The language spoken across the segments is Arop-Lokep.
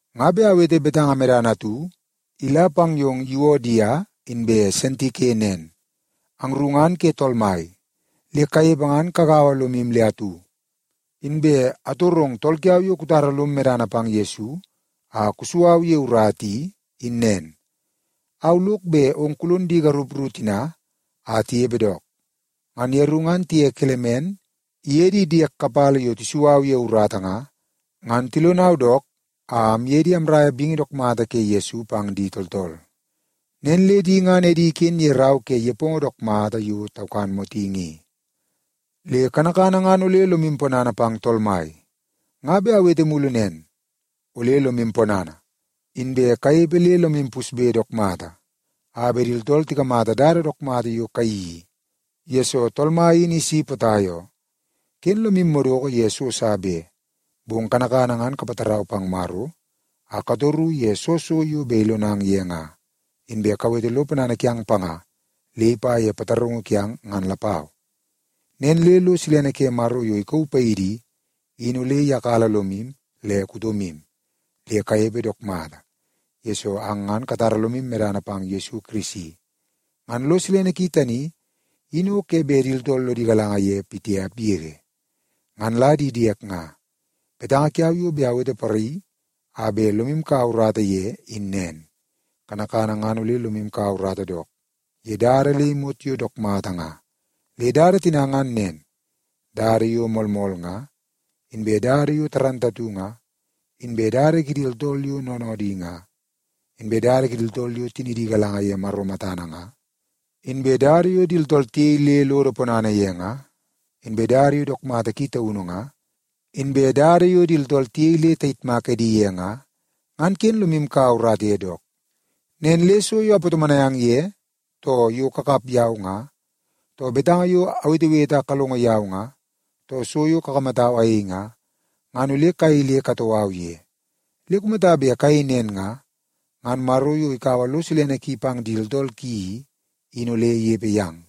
Nga bet awete betanga medana atu ila pang yong Yuodia inbe Sintike nen. Angru ngan ke Tool Mai, le kanepe ngan kagaua lomu le atu. Inbe atorong tool kiau yo kutara lom medana pang Yesu a kusu au ye urata i, in nen. Au lok bet ong kulon di garup ru tina a tinepe dook. Ngan yeru ngan tiye Kelemen iye di diek kapala yo tisu au ye urata nga, ngan tilonau dook a amye di amraia bingi dook mata ke Yesu pang di tooltool. Nen le di ngan edi iken ye rau ke nepongo dook mata yo taukan motingi i. Le kanakana ngan ole lomu ponana pang Tool Mai. Nga bet awete mulu nen, ole lomu ponana! Inbe kanepe le lomu pusbe dook mata a bet di tooltool tikamata dada dook mata yo kayeii i, yesoo Tool Mai in isi potai oo. Ken lomu madoko ye so sa be, bong kanakana ngan kapatarau pang Maro a katoru ye soo so yo bet ilonang ye nga. Inbe kawete lo ponana kiang panga le ipa ye pataraungu kiang ngan lapau. Nen le lo silene ke Maro yo ikauu paidi i, in ole iyakala lomu le kutomu le kanepe dook mata, yesoo ang ngan katara lomu medana pang Yesu Kirisi. Ngan lo silene ki tani, in o ke bet di tooltool lodi galanga ye pitiap yege. Ngan la di diek nga, betanga kiau yo bet awete poraii a bet lomu kaua urata ye, in nen. Kanakana ngan ole lomu kaua urata dook ye dada le imot yo dook mata nga. Le dada tina ngan nen: dada yo moolmool nga, inbe dada yo dundunngana nga, inbe dada kidi tooltool yo noonoodi nga, inbe dada kidi tooltool yo tinidi igalanga ye Maro matana nga, inbe dada yo di tooltool tiyei le lodo ponana ye nga, inbe dada yo dook mata ki taunu nga, inbe dada yo di tooltool tiyei le tayitmak edi ye nga, ngan ken lomu kaua urata ye dook. Nen le so yo apatomonai ang ye, too yo kakap yau nga, too betanga yo awetewete a kalongo yau nga, too so yo kakamatau ayei nga, ngan ole kayei le katoo au ye. Le kumata bet kayei nen nga, ngan Maro yo ikaua lo silene ki pang di tooltool ki i, in ole inepe yang.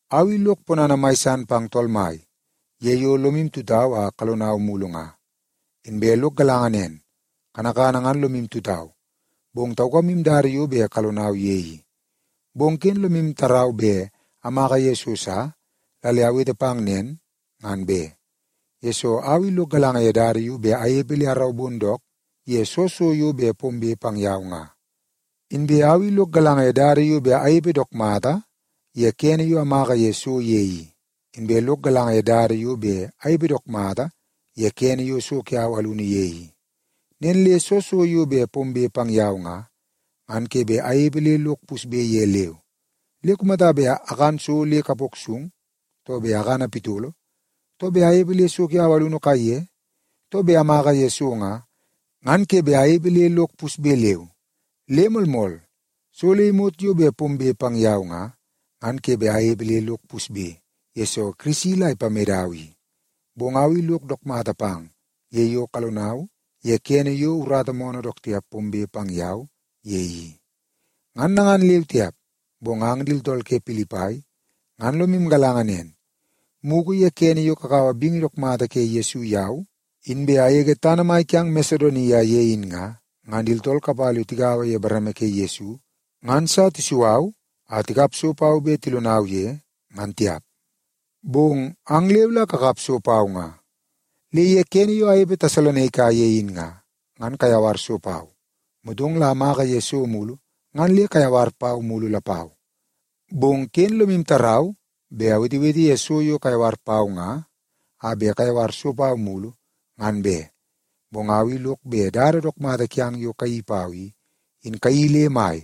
Au i lok ponana mai san pang Tool Mai ye yo lomu tutau a kalonau mulu nga. Inbe lok galanga nen, kanakana ngan lomu tutau, bong taukamu dada yo bet kalonau ye i. Bong ken lomu tarau bet amaka ye so sa la le awete pang nen, ngan be. Yesoo, au i lok galanga ye dada yo bet anepe le araubon dook ye soo so yo bet pombe pang yau nga. Inbe au i lok galanga ye dada yo bet anepe dook mata ye kene yo amaka ye so ye i, inbe lok galanga ye dada yo bet anepe dook mata ye kene yo so kiau alunu ye i. Nen le soo so yo bet pombe pang yau nga, ngan ke bet anepe le lok pusbe ye leu. Le kumata bet akan so le kapok sung, too bet akana pitolo, too bet anepe le so kiau alunu kaiye, too bet amaka ye so nga, ngan ke bet anepe le lok pusbe leu. Le moolmool, so le imot yo bet pombe pang yau nga, ngan ke bet anepe le lok pusbe, yesoo Kirisi la ipamedau i. Bong au i lok dook mata pang ye yo kalonau ye kene yo urata moonoo dook tiap pombe pang yau ye i. Ngan nangan leu tiap, bong ang di tooltool ke Pilipai ngan lomu galanga nen, mugu ye kene yo kakaua bingi dook mata ke Yesu yau, inbe agege tana mai kiang Masedonia ye in nga, ngan di tooltool kapala yo tigaua ye bareme ke Yesu ngan sa tisu au a tikap so pau bet tilonau ye, ngan tiap. Bong ang leu la kakap so pau nga. Le ye kene yo anepe Tesalonaika ye in nga, ngan kayawar so pau. Motong la amaka ye so mulu ngan le kayawar pau mulu lapau. Bong ken lomu tarau bet awetewete ye so yo kayawar pau nga a bet kayawar so pau mulu, ngan be. Bong au i lok bet dada dook mata kiang yo kayeii pau i, in kayeii le mai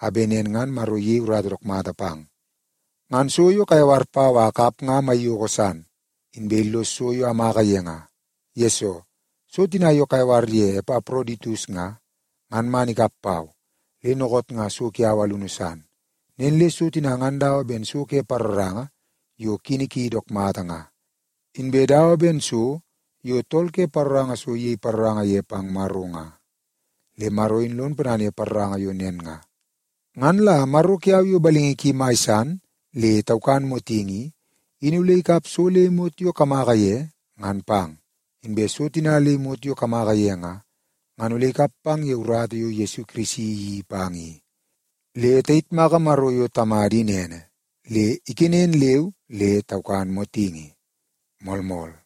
a bet nen ngan Maro iyei urata dook mata pang. Ngan so yo kayawar pau a akap nga maiyoko san, inbe illos so yo amaka ye nga. Yesoo, so tina yo kayawar ye Epaproditus nga, ngan man ikap pau, le dookoot nga so kiau alunu san. Nen le so tina ngan dawa ben so ke paroranga yo kini ki dook mata nga, inbe dawa ben so yo tool ke paroranga so iyei paroranga ye pang Maro nga. Le Maro in lon ponana ye paroranga yo nen nga. Ngan la Maro kiau yo balingi ki mai san le taukan motingi i, in ole ikap so le imot yo kamaka ye ngan pang. Inbe so tina le imot yo kamaka ye nga, ngan ole ikap pang ye urata yo Yesu Kirisi iyeii pang i. Le tayitmaka Maro yo Tamada in ene le ikenen leu le taukan motingi. Moolmool.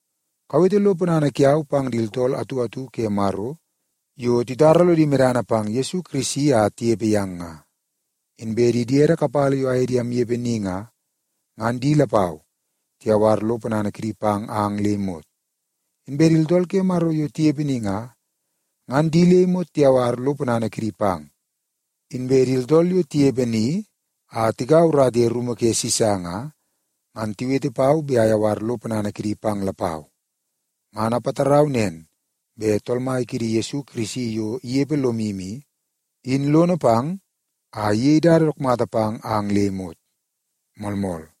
Kawete lo ponana kiau pang di tooltool atu atu ke Maro yo titara lodi medana pang Yesu Kirisi a tinepe yang nga. Inbe di diede kapala yo aye di amnepe ni nga, ngan di lapau tiyawar lo ponana kidi pang ang le imot. Inbe di tooltool ke Maro yo tinepe ni nga, ngan di le imot tiyawar lo ponana kidi pang. Inbe di tooltool yo tinepe ni a tikaua urata ye rumu ke Sisa nga, ngan tiwete pau bet ayawar lo ponana kidi pang lapau. Ngan apatarau nen bet Tool Mai kiidi Yesu Kirisi yo inepe lomu i, in lono pang a iyei dada dook mata pang ang le imot. Moolmool.